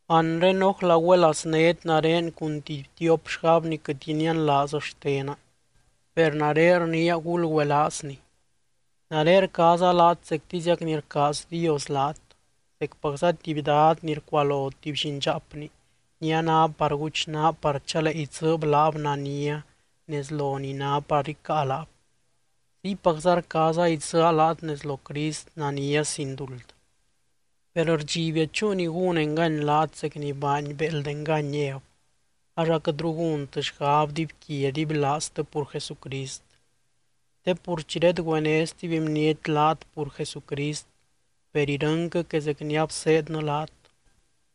Anre, ¡Ójla güelaaznét nare cun tuby tiop xgab ni quɨt inianlaaz xtena! Per nare rniia gulgüelaazni. Nare rcaaza laat zectiziac ni rcaaz Dios laat. Zecpacza tuby dad ni rcualo tuby llindxaapni ni a ná par guchnaa par chalee idzɨɨb laab nania nez lo ni ná par icáa laab, ziypacza rcaaza idzɨɨa laat nez lo Crist nania sin duld. Per rdxibia chúu ni gún engany laat zec ni baany béeld engany Ev, ax aquɨtru gúntɨ xgab dibyquia dibylaaztɨ pur Jesucrist. Te pur chi redgüené stuby bniety laat pur Jesucrist, per irɨnquɨ que zec ni abseednɨ laat,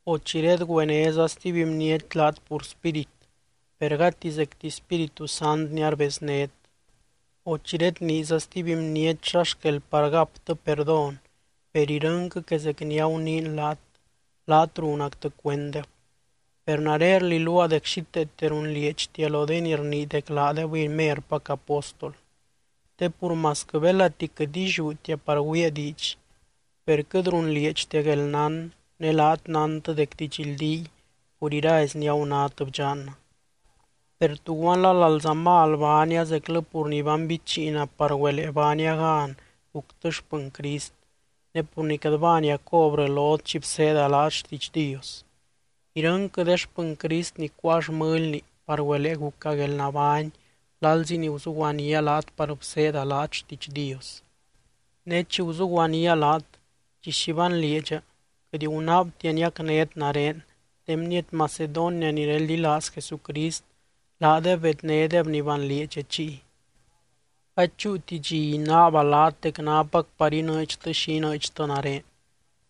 o chi redgüenéza stuby bniety laat pur spírit, per gati zecti Spíritu Sant ni arbeznét, o chi redniiza stuby bniety xa xquel par gaptɨ perdón, per irɨnquɨ que zec ni aguniin laat, laat runactɨ cuenddeb. Per nare rliluaa dec xíteete runlieedxtia lo de ni rnii dec laadebɨy merpac apóstol. Te pur masquɨ belati quɨt illiútia par güiia diidx, per quɨt runlieedxtia guelnán ne laat nántɨ dec didxldíy pur irazi ni agunát bdxannɨ. Per, ¿tuguanla lalza mal baania zeclɨ pur ni banbichiina par güelee baania gan guctɨ xpɨny Crist, ne pur ni quɨt baania cobrɨ lot chi bseeda laat xtiidx Dios? Irɨnquɨ de xpɨny Crist ni cuáa xmɨlni par güelee guca guelnabány lalzi ni guzuguanía laat par bseeda laat xtiidx Dios. Ne chi guzuguanía laat, chi xi banlieedxa quɨt gunaabtia niacnét nare, de bniety Macedonia ni reldilaaz Jesucrist laadeb bednédeb ni banlieedxa chiy. Gady chúuti dxi inaaba laat dec nápac par inɨɨdxtɨ xi inɨɨdxtɨ nare,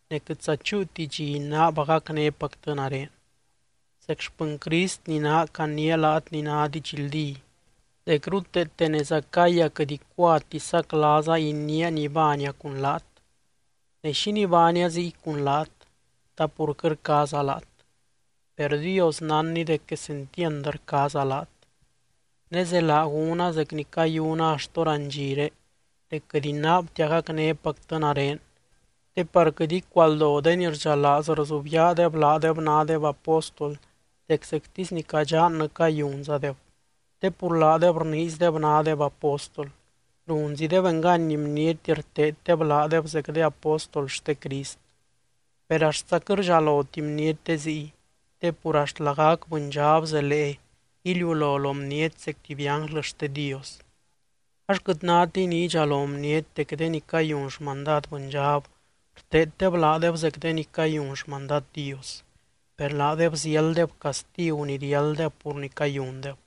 ne quɨtza chúuti dxi inaaba gacnépactɨ nare. Zec xpɨny Crist ni naa caniia laat ni ná didxldí, dec ruteete nez Acaya quɨt icuati saclaaza iniia ni baania cun laat. Ne, ¿xínii baania ziy cun laat? ¿Ta pur quɨt rcaaza laat? Per Dios nánny dec quesentiand rcaaza laat. Ne zelaa gúna zec ni cayuna axt hórandxire dec quɨt inaabtia gacnépactɨ nare, te par quɨt icualdo de ni rdxalaaz rzubyaadeb laadeb nádeb apóstol dec zectisy ni cadxannɨ cayunzadeb. Te pur laadeb rniizdeb nádeb apóstol, runzideb engany bniety rteeddeb laadeb zec de apóstol xte Crist. Per axtza quɨt rdxaloti bniety de ziy, te pur axt lagac bɨndxab zelee iliulo lo bniety zec tuby ánglɨ xte Dios. Ax quɨt nátiy ni idxalo bniety dec de ni cayun xmandad bɨndxab rteeddeb laadeb zec de ni cayun xmandad Dios. Per laadeb ziálddeb castigu ni riálddeb pur ni cayundeb.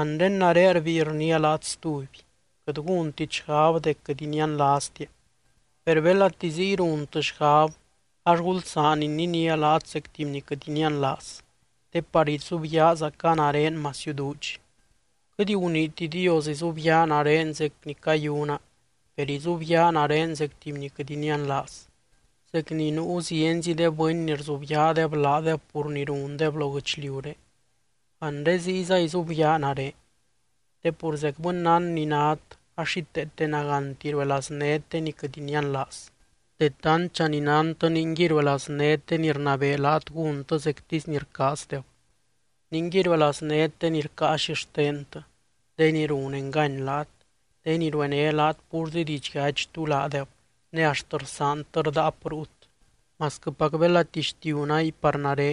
Anre nare rbíi rniia laat stuby: Quɨt gúntit xgab dec quɨt inianlaaztia, per belati ziy runtɨ xgab ax gulsaan ininía laat zec tuby ni quɨt inianlaaz te par izubyaazaca nare masiu duudx. Quɨt guniiti Dios izubyaa nare zec ni cayuna, per izubyaa nare zec tuby ni quɨt inianlaaz. Zec ni nuu zienzi de bɨny ni rzubyaadeb laadeb pur ni rundeb lo guɨchliuré, anre ziyza izubyaa nare. Te pur zec bɨnnán ni nát ax xíteete nagánti ruelaaznét de ni quɨt inianlaaz. De tantdxa ni nántɨ ningui ruelaaznét de ni rnabee laat gúntɨ zectisy ni rcaazdeb, ningui ruelaaznét de ni rcáa xixtentɨ, de ni run engany laat, de ni ruené laat púrzi didxyachy tú laadeb ne axt rsaantɨ rdaap ruut. Masquɨpac belati xtiu náy par nare,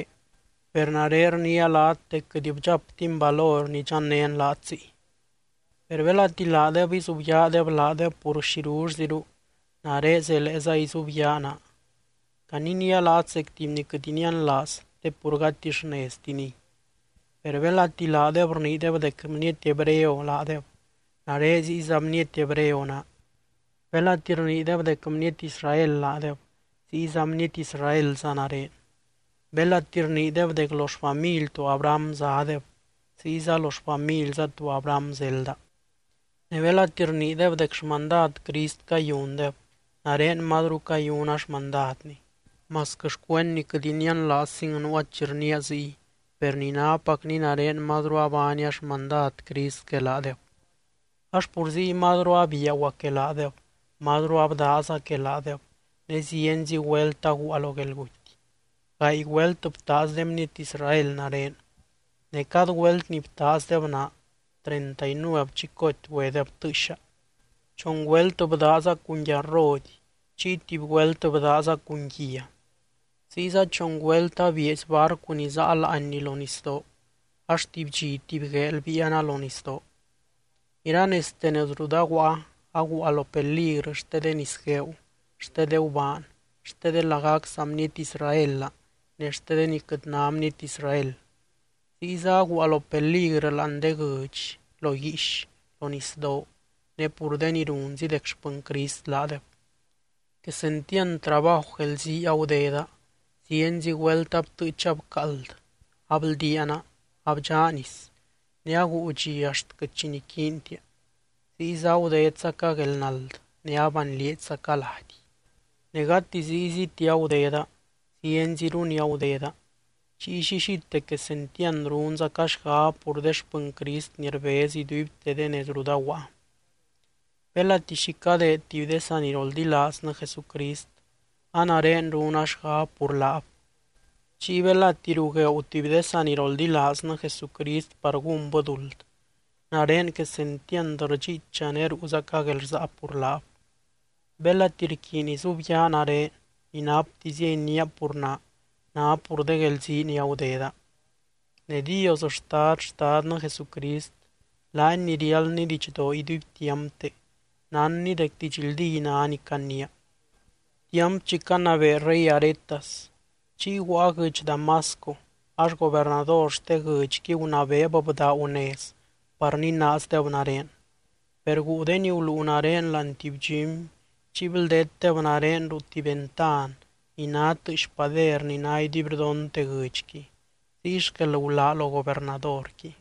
per nare rniia laat dec quɨt bdxaptin valor nidxannén laat ziy. Per belati laadeb izubyaadeb laadeb pur xirullziru, nare zeleeza izubyaa naa. Caniniia laat zec tuby ni quɨt inianlaaz, te pur gati xneztiniy. Per belati laadeb rniideb dec bniety hebreo laadeb, nare ziyza bniety hebreo naa. Belati rniideb dec bniety Israel laadeb, ziyza bniety Israelza nare. Belati rniideb dec lo xfamily to Abraham zádeb, ziyza lo xfamilza to Abraham zelda. Ne belati rniideb dec xmandad Crist cayundeb, nare mazru cayuna xmandadny. Masquɨ xcuend ni quɨt inianlaazzing nuua chi rniia ziy, per ni nápacni nare mazru abaania xmandad Crist que laadeb. Ax pur ziy mazru abiaguaa que laadeb, mazru abdaaza que laadeb ne zienzi güelt aguua lo guelguty. Gaay güelt btaaz de bniety Israel nare, ne cad güelt ni btaazdeb naa treinta y nuev chicoty güedeb tɨɨxa. Chon güelt bdaaza cun yarrody, chiy tuby güelt bdaaza cun guia. Ziyza chon güelt abieezy barcu ni záa láanni lo nisdoo, ax tuby dxi tuby gueel biiana lo nisdoo. Iranezte nez rut aguaa, aguua lo peligrɨ xte de nisgueeu, xte de gubaan, xte de lagac saa bniety Israelaa ne xte de ni quɨt ná bniety Israel. Ziyza aguua lo peligrɨ láani de guɨdx, lo guiix, lo nisdoo, ne pur de ni runzi dec xpɨny Crist laadeb. Quesentiand trabaju guelzii agudeda. Zienzi güelt abtɨɨcha bcaald, abldiaana, abdxá nis, ne aguu dxi axt quɨt xi niquiintia. Ziyza agudedzaca guelnald, ne abanlieedxzaca lady. Ne gati zíyziti agudeda, zienziru ni agudeda. Chiy llillite quesentiand runzaca xgab pur de xpɨny Crist ni rbez iduibte de nez rut aguaa. Belati xi cadeed tuby de saniroldilaaznɨ Jesucrist, a nare runa xgab pur laab. Chiy belati rugueeu tuby de saniroldilaaznɨ Jesucrist par gúnbɨ duld, nare quesentiand rdxiicha ne ruuzaca guelrsaa pur laab. Belati rquiiny izubyaa nare, ni naptizia iniia pur naa, ná pur de guelzii ni agudeda. Ne Dios Xtad Xtadnɨ Jesucrist, laany ni riáldny didxdoo iduibtiampte, nánny dec didxldí ná ni caniia. Tiamp chi canabee rey Aretas, chiy guaa guɨdx Damasco ax gobernador xte guɨdxqui gunabeeb bdaagu nez par ninaazdeb nare. Per guu de ni guluu nare láani tuby dxumy chiy bldeetdeb nare ruu tuby ventan ni ná tɨɨx pader ni ná iduibrdonte guɨdxqui, ziy xquel gulaa lo gobernadorqui.